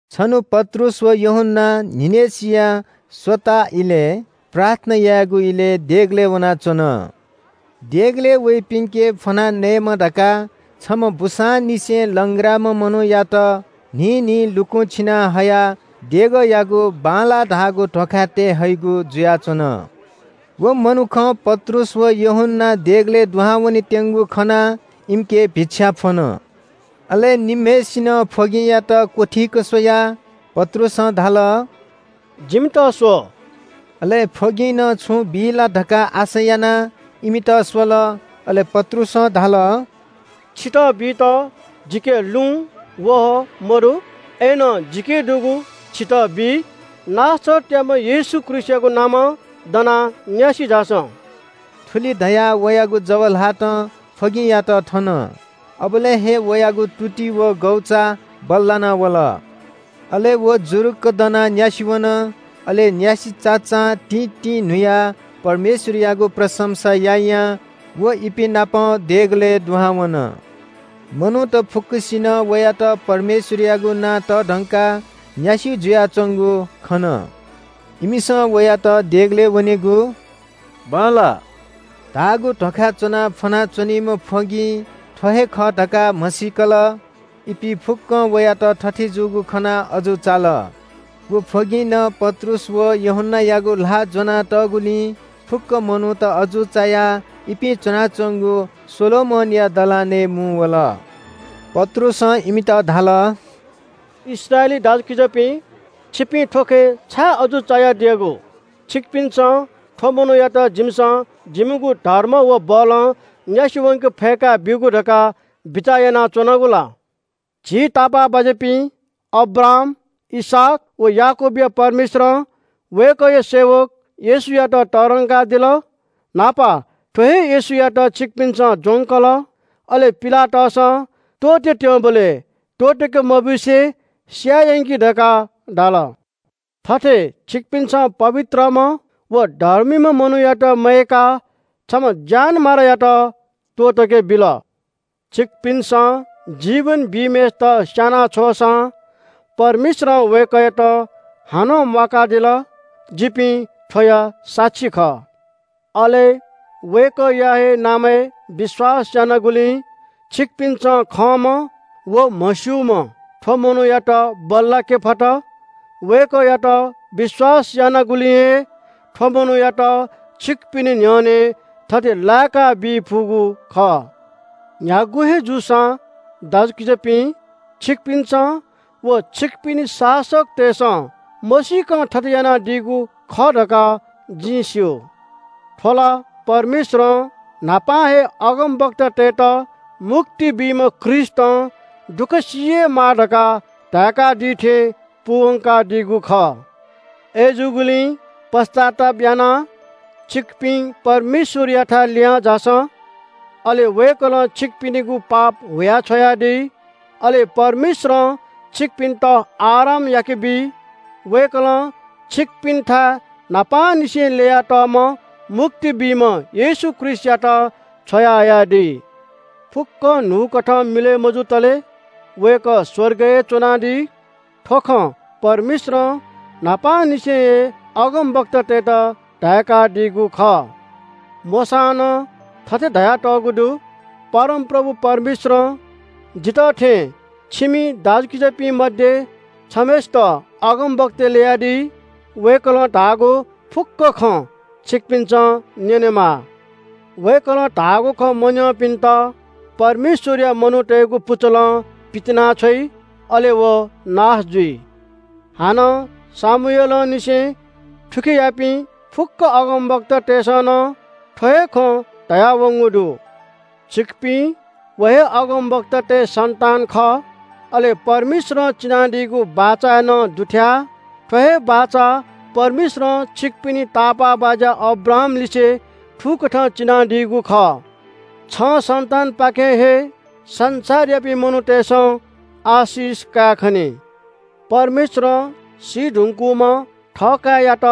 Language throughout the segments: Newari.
छन्‍हु पत्रुस व यूहन्‍ना न्‍हिनय्‌सिया स्‍वताः इलय्, प्रार्थना यायेगु इलय् देगलय् वनाच्‍वन। देगलय् वइपिन्‍के फ्‍वनाः नयेमा धकाः छम्‍ह बूसांनिसें लंग्राम्‍ह मनूयात न्‍हिं न्‍हिं लुकुं छिना हयाः देगःयागु “बांलाः” धाःगु ध्‍वाखाय् तये हइगु जुयाच्‍वन। व मनुखं पत्रुस व यूहन्‍ना देगलय् दुहां वनेत्‍यंगु खनाः इमिके भिक्षा फ्‍वन। अले निम्‍हय्‌सिनं फ्‍वगिंयात क्‍वथीक स्‍वयाः पत्रुसं धाल – “जिमित स्‍व।” अले फ्‍वगिंनं छुं बी ला धकाः आशा यानाः इमित स्‍वल। अले पत्रुसं धाल – “छितः बीत जिके लुँ, वहः मदु, अय्‌नं जिके दुगु छितः बी। नासरतयाम्‍ह येशू ख्रीष्‍टयागु नामं दनाः न्‍यासि झासँ।” थुलि धयाः वयागु जव ल्‍हातं फ्‍वगिंयात थन। अबलय् हे वयागु तुति व गौचा बल्‍लाना वल। अले व जुरुक्‍क दनाः न्‍यासि वन। अले न्‍यासि चाचां तिंतिंन्‍हुयाः परमेश्‍वरयागु प्रशंसा यायां व इपिं नाप देगलय् दुहां वन। मनूत फुक्‍कसिनं वयात परमेश्‍वरयागु नां तःधंकाः न्‍यासि जुयाच्‍वंगु खन। इमिसं वयात देगलय् वनेगु “बांलाः” धाःगु ध्‍वाखाय् च्‍वनाः फ्‍वना च्‍वनीम्‍ह फ्‍वगिं थ्‍व हे खः धकाः म्‍हसीकल। इपिं फुक्‍कं वयात थथे जूगु खनाः अजू चाल। व फ्‍वगिंनं पत्रुस व यूहन्‍नायागु ल्‍हाः ज्‍वना तःगुलिं फुक्‍क मनूत अजू चायाः इपिं च्‍वनाच्‍वंगु सोलोमनया दलानय् मुंवल। पत्रुसं इमित धाल – “इस्राएली दाजुकिजापिं, छिपिं थ्‍व खँय् छाय् अजू चायाः दियागु? छिकपिन्‍सं थ्‍व मनूयात जिमिसं जिमिगु धर्म व बलं न्‍यासि वंके फय्‌का ब्‍यूगु धकाः बिचाः यानाच्‍वनागु ला? झी तापाःबाज्‍यापिं अब्राहाम, इसहाक व याकूबया परमेश्‍वरं वय्‌कःया सेवक येशूयात तःधंकादिल। न्‍हापा थ्‍व हे येशूयात छिकपिन्‍सं ज्‍वंकल। अले पिलातसं त्‍वःतेत्‍यंबलय् त्‍वःतके मब्‍यूसे स्‍याये यंकि धकाः धाल। थथे छिकपिन्‍सं पवित्रम्‍ह व धर्मीम्‍ह मनूयात मयय्‌काः छम्‍ह ज्‍यानमारायात त्‍वःतके बिल। छिकपिन्‍सं जीवन बीम्‍हय्‌सित स्‍याना छ्वःसां परमेश्‍वरं वय्‌कःयात हानं म्‍वाकादिल। जिपिं थ्‍वया साक्षी खः। “अले वय्‌कःया हे नामय् विश्‍वास यानागुलिं छिकपिन्‍सं खंम्‍ह व म्‍हस्‍यूम्‍ह थ्‍व मनूयात बल्‍लाके फत। वय्‌कःयात विश्‍वास यानागुलिं हे थ्‍व मनूयात छिकपिनि न्‍ह्यःने थथे लाय्‌काबी फुगु खः।” “न्‍ह्यागु हे जूसां दाजुकिजापिं, छिकपिन्‍सं व छिकपिनि शासकतय्‌सं मसीकं थथे यानादीगु खः धकाः जिं स्‍यू। थ्‍व ला परमेश्‍वरं न्‍हापां हे अगमवक्तातय्‌त मुक्ति बीम्‍ह ख्रीष्‍टं दुःख सी हे माः धकाः धाय्‌कादी थें पूवंकादीगु खः। अय्‌जूगुलिं पश्‍चाताप यानाः छिकपिं परमेश्‍वरयाथाय् लिहांझासँ, अले वय्‌कलं छिकपिनिगु पाप हुयाछ्‌वयादी। अले परमेश्‍वरं छिकपिन्‍त आराम याकेबी। वय्‌कलं छिकपिन्‍थाय् न्‍हापांनिसें ल्‍ययातःम्‍ह मुक्ति बीम्‍ह येशू ख्रीष्‍टयात छ्वयाहयादी। फुक्‍कं न्‍हूकथं मिलय् मजुतले वय्‌कः स्‍वर्गय् हे च्‍वनादी। थ्‍व खँ परमेश्‍वरं न्‍हापांनिसें हे अगमवक्तातय्‌त धाय्‌कादीगु खः। मोशां नं थथे धयातःगु दु – “‘परमप्रभु परमेश्‍वरं जितः थें छिमि इस्राएली दाजुकिजापिं मध्‍ये छम्‍हय्‌सित अगमवक्ता ल्‍ययादी। वय्‌कलं धाःगु फुक्‍क खँ छिकपिन्‍सं न्‍यनेमाः। वय्‌कः अगमवक्तां धाःगु खँ मन्‍यंपिन्‍त परमेश्‍वरया मनूतय्‌गु पुचलं पितिनाछ्वइ, अले व नाश जुइ।’ “हानं शमूएलंनिसें थुखेयापिं फुक्‍क अगमवक्तातय्‌सं नं थ्‍व हे खँ धयावंगु दु। छिकपिं व हे अगमवक्तातय्‌ सन्‍तान खः, अले परमेश्‍वरं चिनादीगु बाचाय् नं दुथ्‍याः। थ्‍व हे बाचा परमेश्‍वरं छिकपिनि तापाःबाज्‍या अब्राहामलिसे थुकथं चिनादीगु खः – ‘छं सन्‍तानपाखें हे संसारयापिं मनूतय्‌सं आशिष कायेखनी।’ परमेश्‍वरं सी धुंकूम्‍ह थःकाय्‌यात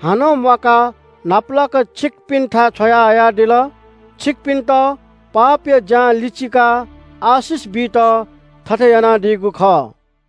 हानं म्‍वाकाः न्‍हापालाक छिकपिन्‍थाय् छ्वयाहयादिल। छिकपिन्‍त पापया ज्‍यां लिचिकाः आशिष बीत थथे यानादीगु खः।”